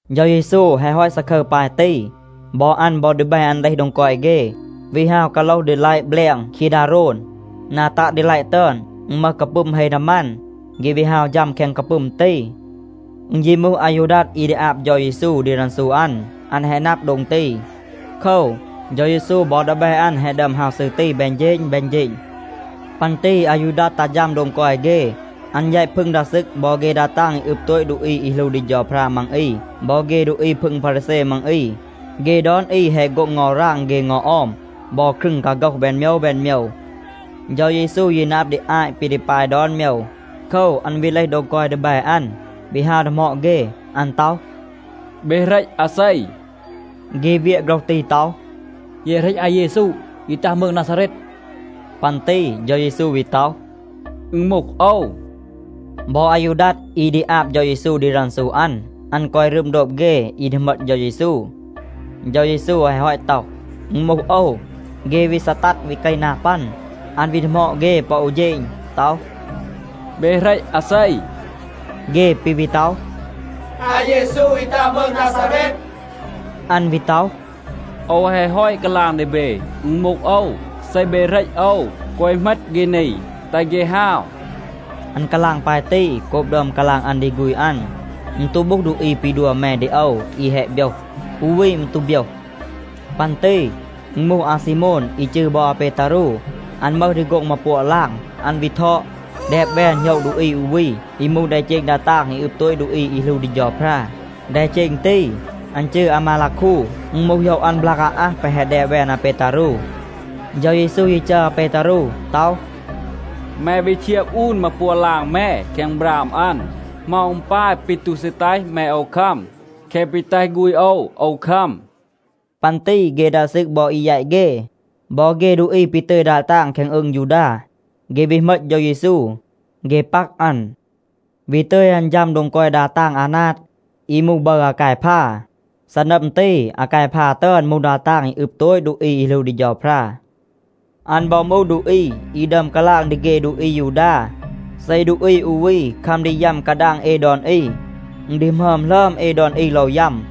เฌา เยซู แฮะ ฮอต ซาคึร ปาย ตี, บอ อัน บอ ดีแบ อัน เลห โดง กอย เฆ, วี ฮาว กาโลห ดีลัยะ แบลง คีดาโรน. นา ตัะ ดีลัยะ ตึอน, อึณ มึห กาปึม เฮ นามัน. เฆ วี ฮาว ฌัม แคง กาปึม ตี. อึณ ยี มูห อายูดัด อี ดี อาบ เฌา เยซู ดี รันซู อัน, อัน แฮะ นับ โดง ตี. โคว, เฌา เยซู บอ ดีแบ อัน แฮะ ดึอม ฮาว ซืร ตี แบน เฌณ แบน เฌณ. ปัน ตี อายูดัด ตัห ฌัม โดง กอย เฆ. อัน แยต พึง ดา ซึก บอ เฆ ดา ตาง อี อึบ โตต ดูอี อี หลู ดี เฌาพรา มัง อี บอ เฆ ดูอี พึง พารีแซ มัง อี. เฆ ดอน อี แฮะ โฆ็ง เงา ราง เฆ เงา ออม บอ ครึง กาโฆห แบน โมยว แบน โมยว. เฌา เยซู ยี นับ ดี อาต ปี ดี ปาย ดอน โมยว. โคว, อัน วี เลห โดง กอย ดีแบ อัน, วี ฮาว ดีหมอด เฆ. อัน ต็อห, “เบ เหรต อาเซ?” เฆ เวียะ โฆรห ตี ต็อห, “เย เหรต อาเยซู, อี ตัห มืง นาซาเรต.” ปัน ตี เฌา เยซู วี ต็อห, “อึณ มูห โอว.” บอ อายูดัด อี ดี อาบ เฌา เยซู ดี รันซู อัน, อัน กอย รึม โดบ เฆ อี ดี เหมต เฌา เยซู. เฌา เยซู แฮะ ฮอต ต็อห, “อึณ มูห โอว,” เฆ วี ซีตัด, วี เกห นา ปัน. อัน วี ดีหมอด เฆ ปอ อู เฌณ ต็อห, “เบ เหรต อาเซ?” เฆ ปี วี ต็อห, “อาเยซู, อี ตัห มืง นาซาเรต.” อัน วี ต็อห, “โอว แฮะ ฮอต กาลาง ดี เบ, อึณ มูห โอว. เซ เบ เหรต โอว, แกวะ เหมต เฆ นี, แตห เฆ ฮาว.” อัน กาลาง ปาย ตี, โกบ ดึอม กาลาง อัน ดี ฆูณ อัน, “อึณ ตู มึห ดูอี ปี ดัว แม ดี โอว อี แฮะ โบยห. อู วี มืร ตู โบยห.” ปัน ตี อึณ มูห อาซีโมน, อี จืร บอ อาเปตารู. อัน มึห ดี โฆ็ง มาปัวะ ลาง. อัน วี ทอด, แดบ แวน โหยะ ดูอี อู วี, อี มูห แดเจณ ดา ตาง อี อึบ โตต ดูอี อี หลู ดี เฌาพรา. แดเจณ ตี, อัน จืร อามาลาคู. อึณ มูห โหยะ อัน บลาก อาอัห แปะ แฮะ แดบ แวน อาเปตารู. เฌา เยซู ยี จัร อาเปตารู ต็อห, “แม วี เชียบ อูน มาปัวะ ลาง แม แคง บราม อัน. เหมา อึณ ปาย ปี ตู ซี แตห แม โอว คัม แคะ ปี แตห ฆูณ โอว โอว คัม?” ปัน ตี เฆ ดา ซึก บอ อี แยต เฆ, บอ เฆ ดูอี ปี ตึย ดา ตาง แคง อืง ยูดา, เฆ วี เหมต เฌา เยซู. เฆ ปัก อัน, วี ตึย อัน ฌัม โดง กอย ดา ตาง อานาด, อี มูห บึร อากายพา. ซีนัม ตี อากายพา ตึอน มูห ดา ตาง อี อึบ โตต ดูอี อี หลู ดี เฌาพรา. อัน บอ มูห ดูอี อี ดึอม กาลาง ดี เฆ ดูอี อายูดา, “เซ ดูอี อู วี คัม ดี ยัม กาดาง เอ ดอน อี, อึณ ดี หมึอม หลึอม เอ ดอน อี โลว ยัม.”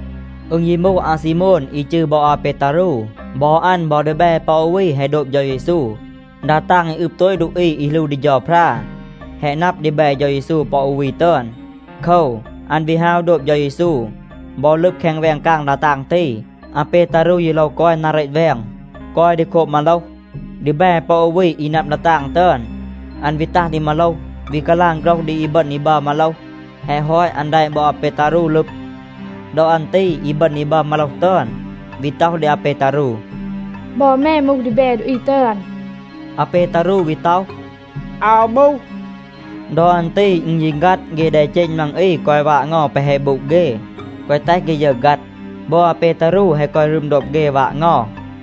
อึณ ยี มูห อาซีโมน อี จืร บอ อาเปตารู. บอ อัน บอ ดีแบ ปอ อู วี แฮะ โดบ เฌา เยซู. ดา ตาง อี อึบ โตต ดูอี อี หลู ดี เฌาพรา แฮะ นับ ดีแบ เฌา เยซู ปอ อู วี ตึอน. โคว, อัน วี ฮาว โดบ เฌา เยซู บอ ลึบ แคง แวง กาง ดา ตาง ตี. อาเปตารู ยี โลว กอย นา เรต แวง, กอย ดี โคบ มาโลห. ดีแบ ปอ อู วี อี นับ ดา ตาง ตึอน, อัน วี ตัห ดี มาโลห, วี กาลาง โฆรห ดี อีบึณ อี บัร มาโลห. แฮะ ฮอต อัน แดะ บอ อาเปตารู ลึบ. ดอ อัน ตี อีบึณ อี บัร มาโลห ตึอน วี ต็อห ดี อาเปตารู, “บอ แม มูห ดีแบ ดูอี ตึอน.” อาเปตารู วี ต็อห, “อาว มูห.” ดอ อัน ตี อึณ ยี ฆัด. เฆ แดเจณ มัง อี กอย วาด เงา แปะ แฮะ บูด เฆ, แกวะ แตห เฆ ยึร ฆัด. บอ อาเปตารู แฮะ กอย รึม โดบ เฆ, วาด เงา.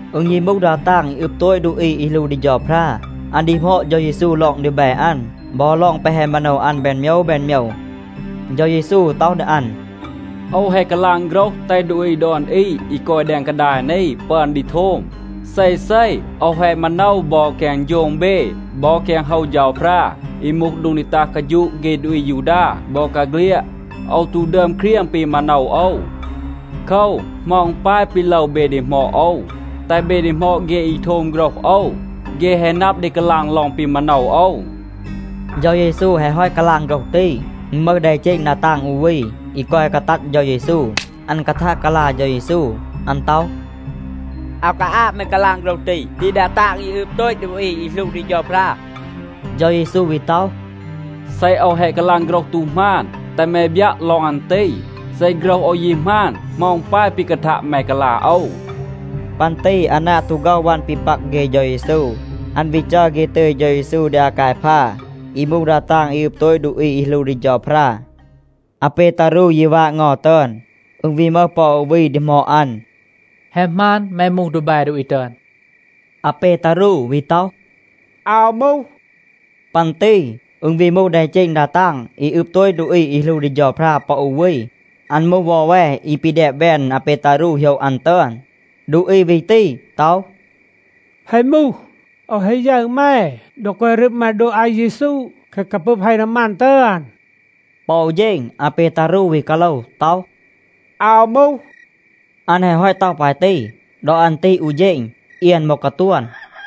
อึณ ยี มูห ดา ตาง อี อึบ โตต ดูอี อี หลู ดี เฌาพรา, อัน ดีหมอด เฌา เยซู ลอง ดีแบ อัน บอ ลอง แปะ แฮะ มาโนว อัน แบน โมยว แบน โมยว. เฌา เยซู ต็อห ดี อัน, “โอว แฮะ กาลาง โฆรห, แตห ดูอี ดอน อี อี กอย แดง กาดาย นี ปึอน ดี โทม. เซเซ โอว แฮะ มาโนว บอ แคง โฌง เบ บอ แคง โฮว เฌาพรา, อี มูห โดง ดี ตัห กาฌูะ เฆ ดูอี อายูดา บอกาเฆลียด. โอว ตู ดึอม เครียง ปี มาโนว โอว. โคว, เหมา อึณ ปาย ปี โลว เบ ดีหมอด โอว? แตห เบ ดีหมอด เฆ อี โทม โฆรห โอว. เฆ แฮะ นับ ดี กาลาง ลอง ปี มาโนว โอว.” เฌา เยซู แฮะ ฮอต กาลาง โฆรห ตี, อึณ มึห แดเจณ ดา ตาง อู วี, อี กอย กาตัด เฌา เยซู. อัน กาทัะ กาลา เฌา เยซู. อัน ต็อห, “อาว กาอาบ แม กาลาง โฆรห ตี ดี ดา ตาง อี อึบ โตต ดูอี อี หลู ดี เฌาพรา.” เฌา เยซู วี ต็อห, “เซ โอว แฮะ กาลาง โฆรห ตู หมาน, แตห แม บยัะ ลอง อัน ตี. เซ โฆรห โอว ยี หมาน, เหมา อึณ ปาย ปี กาทัะ แม กาลา โอว?” ปัน ตี อานาด ตู ฆ็อห วัน ปี ปัก เฆ เฌา เยซู, อัน วี จัร เฆ ตึย เฌา เยซู ดี อากายพา, อี มูห ดา ตาง อี อึบ โตต ดูอี อี หลู ดี เฌาพรา. อาเปตารู ยี วาด เงา ตึอน. อึณ วี มึห ปอ อู วี ดีหมอด อัน, “แฮะ หมาน, แม มูห ดีแบ ดูอี ตึอน?” อาเปตารู วี ต็อห, “อาว มูห.” ปัน ตี อึณ วี มูห แดเจณ ดา ตาง อี อึบ โตต ดูอี อี หลู ดี เฌาพรา ปอ อู วี. อัน มูห วอแว อี ปี แดบ แวน อาเปตารู โหยะ อัน ตึอน. ดูอี วี ตี ต็อห, “แฮะ มูห, โอว แฮะ ยึร แม ดอ กอย รึม แม โดบ อาเยซู แคง กาปึม เฮ นามัน ตึอน.” ปอ อู เฌณ อาเปตารู วี กาโลว ต็อห, “อาว มูห.” อัน แฮะ ฮอต ต็อห ปาย ตี, ดอ อัน ตี อู เฌณ เอียน บอ กาตวน.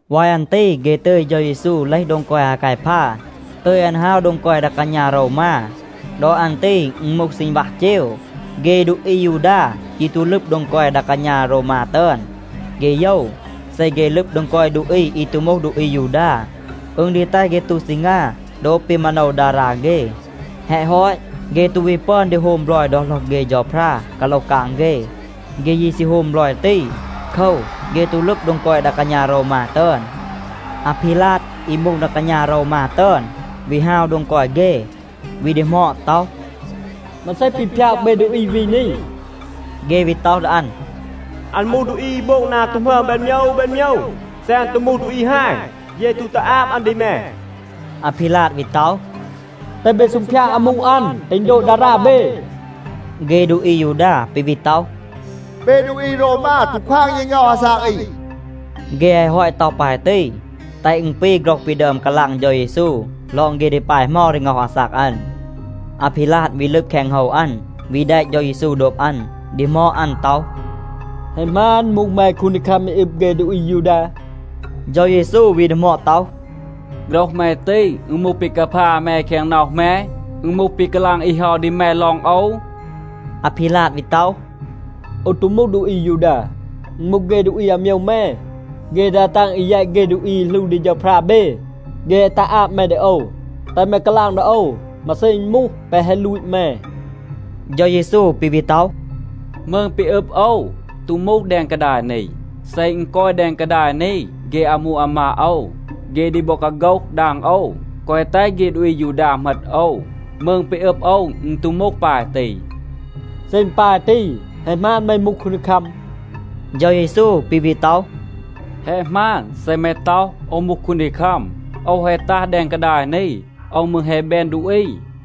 วาย อัน ตี เฆ ตึย เฌา เยซู เลห โดง กอย อากายพา, ตึย อัน ฮาว โดง กอย ดา กาณา โรวมา. ดอ อัน ตี อึณ มูห ซีณวัห เจว. เฆ ดูอี อายูดา ยี ตู ลึบ โดง กอย ดา กาณา โรวมา ตึอน. เฆ โยว, เซ เฆ ลึบ โดง กอย ดูอี อี ตู มูห ดูอี อายูดา, อึณ ดี แตห เฆ ตู ซีงา โดบ ปี มาโนว ดารา เฆ. แฮะ ฮอต, เฆ ตู วี ปึอน ดี โฮม บลอย ดอ โหลห เฆ เฌาพรา กาโลห กาง เฆ. เฆ ยี ซี โฮม บลอย ตี. โคว, เฆ ตู ลึบ โดง กอย ดา กาณา โรวมา ตึอน. อาพีลาด อี มูห ดา กาณา โรวมา ตึอน, วี ฮาว โดง เฆ, วี ดีหมอด ต็อห, “มาเซ ปี พยาก เบ ดูอี วี นี?” เฆ วี ต็อห ดี อัน, “อัน มูห ดูอี อี โบง นา ตู หมึอม แบน โมยว แบน โมยว. เซ อัน ตู มูห ดูอี ฮาย, เย ตู ตัห อาบ อัน ดี แม.” อาพีลาด วี ต็อห, “แตห เบ ซูงพยาด อามู อัน, แตห อึณ โดบ ดารา เบ.” เฆ ดูอี อายูดา ปี วี ต็อห, “เบ ดูอี โรวมา ตู ควาง เย ง็อห อาซาก อี.” เฆ แฮะ ฮอต ต็อห ปาย ตี, แตห อึณ ปี โฆรห ปี ดึอม กาลาง เฌา เยซู ลอง เฆ ดี ปาย เหมา ดี ง็อห อาซาก อัน. อาพีลาด วี ลึบ แคง โฮว อัน, วี แดะ เฌา เยซู โดบ อัน, ดีหมอด อัน ต็อห, “แฮะ หมาน, มูห แม คูนดีคัม อี อึบ เฆ ดูอี อายูดา?” เฌา เยซู วี ดีหมอด ต็อห, “โฆรห แม ตี, อึณ มูห ปี กาพา แม แคง น็อห แม? อึณ มูห ปี กาลาง อี เฮา ดี แม ลอง โอว?” อาพีลาด วี ต็อห, “โอว ตู มูห ดูอี อายูดา. อึณ มูห เฆ ดูอี อาโมยว แม, เฆ ดา ตาง อี แยต เฆ ดูอี อี หลู ดี เฌาพรา เบ, เฆ แฮะ ตัห อาบ แม ดี โอว. แตห แม กาลาง ดี โอว, มาเซ อึณ มูห, แปะ แฮะ ลูต แม?” เฌา เยซู ปี วี ต็อห, “มืง ปี อึบ โอว ตู มูห แดง กาดาย นี. เซ อึณ กอย แดง กาดาย นี, เฆ อามู อามาด โอว, เฆ ดี บอ กาโฆห ดาง โอว, แกวะ แตห เฆ ดูอี อายูดา เหมต โอว. มืง ปี อึบ โอว, อึณ ตู มูห ปาย ตี.” ปัน ตี อาพีลาด วี ดีหมอด ต็อห, “เซ อึณ ปาย ตี, แฮะ หมาน, แม มูห คูนดีคัม?” เฌา เยซู ปี วี ต็อห, “แฮะ หมาน เซ แม ต็อห, โอว มูห คูนดีคัม. โอว แฮะ ตัห แดง กาดาย นี. โอว มืร แฮะ แบน ดูอี,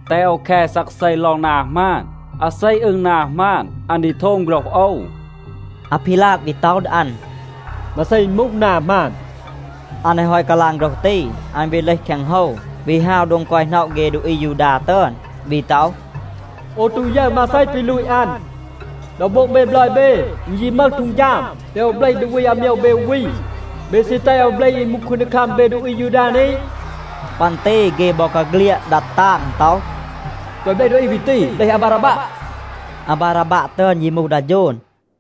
แตห โอว แค ซักเซ ลอง นา หมาน. อาเซ อึง นา หมาน, อัน ดี โทม โฆรห โอว.” อาพีลาด วี ต็อห ดี อัน, “มาเซ อึณ มูห, นา หมาน?” อัน แฮะ ฮอต กาลาง โฆรห ตี, อัน วี เลห แคง โฮว, วี ฮาว โดง กอย หน็อะ เฆ ดูอี อายูดา ตึอน, วี ต็อห, “โอว ตู ยึร มาเซ ปี ลูต อัน. ดอ โบง เบ บลอย เบ, อึณ ยี มึห ฮีด, แตห โอว เบลห ดูอี อาโมยว เบ อู วี. เบ ซี แตห โอว เบลห อี มูห คูนดีคัม เบ ดูอี อายูดา นี?” ปัน ตี เฆ บอกาเฆลียด ดัด ตาง ต็อห, “แกวะ เบลห ดูอี วี ตี. เบลห อาบาราบัะ.” อาบาราบัะ ตึอน ยี มูห ดา โฌน.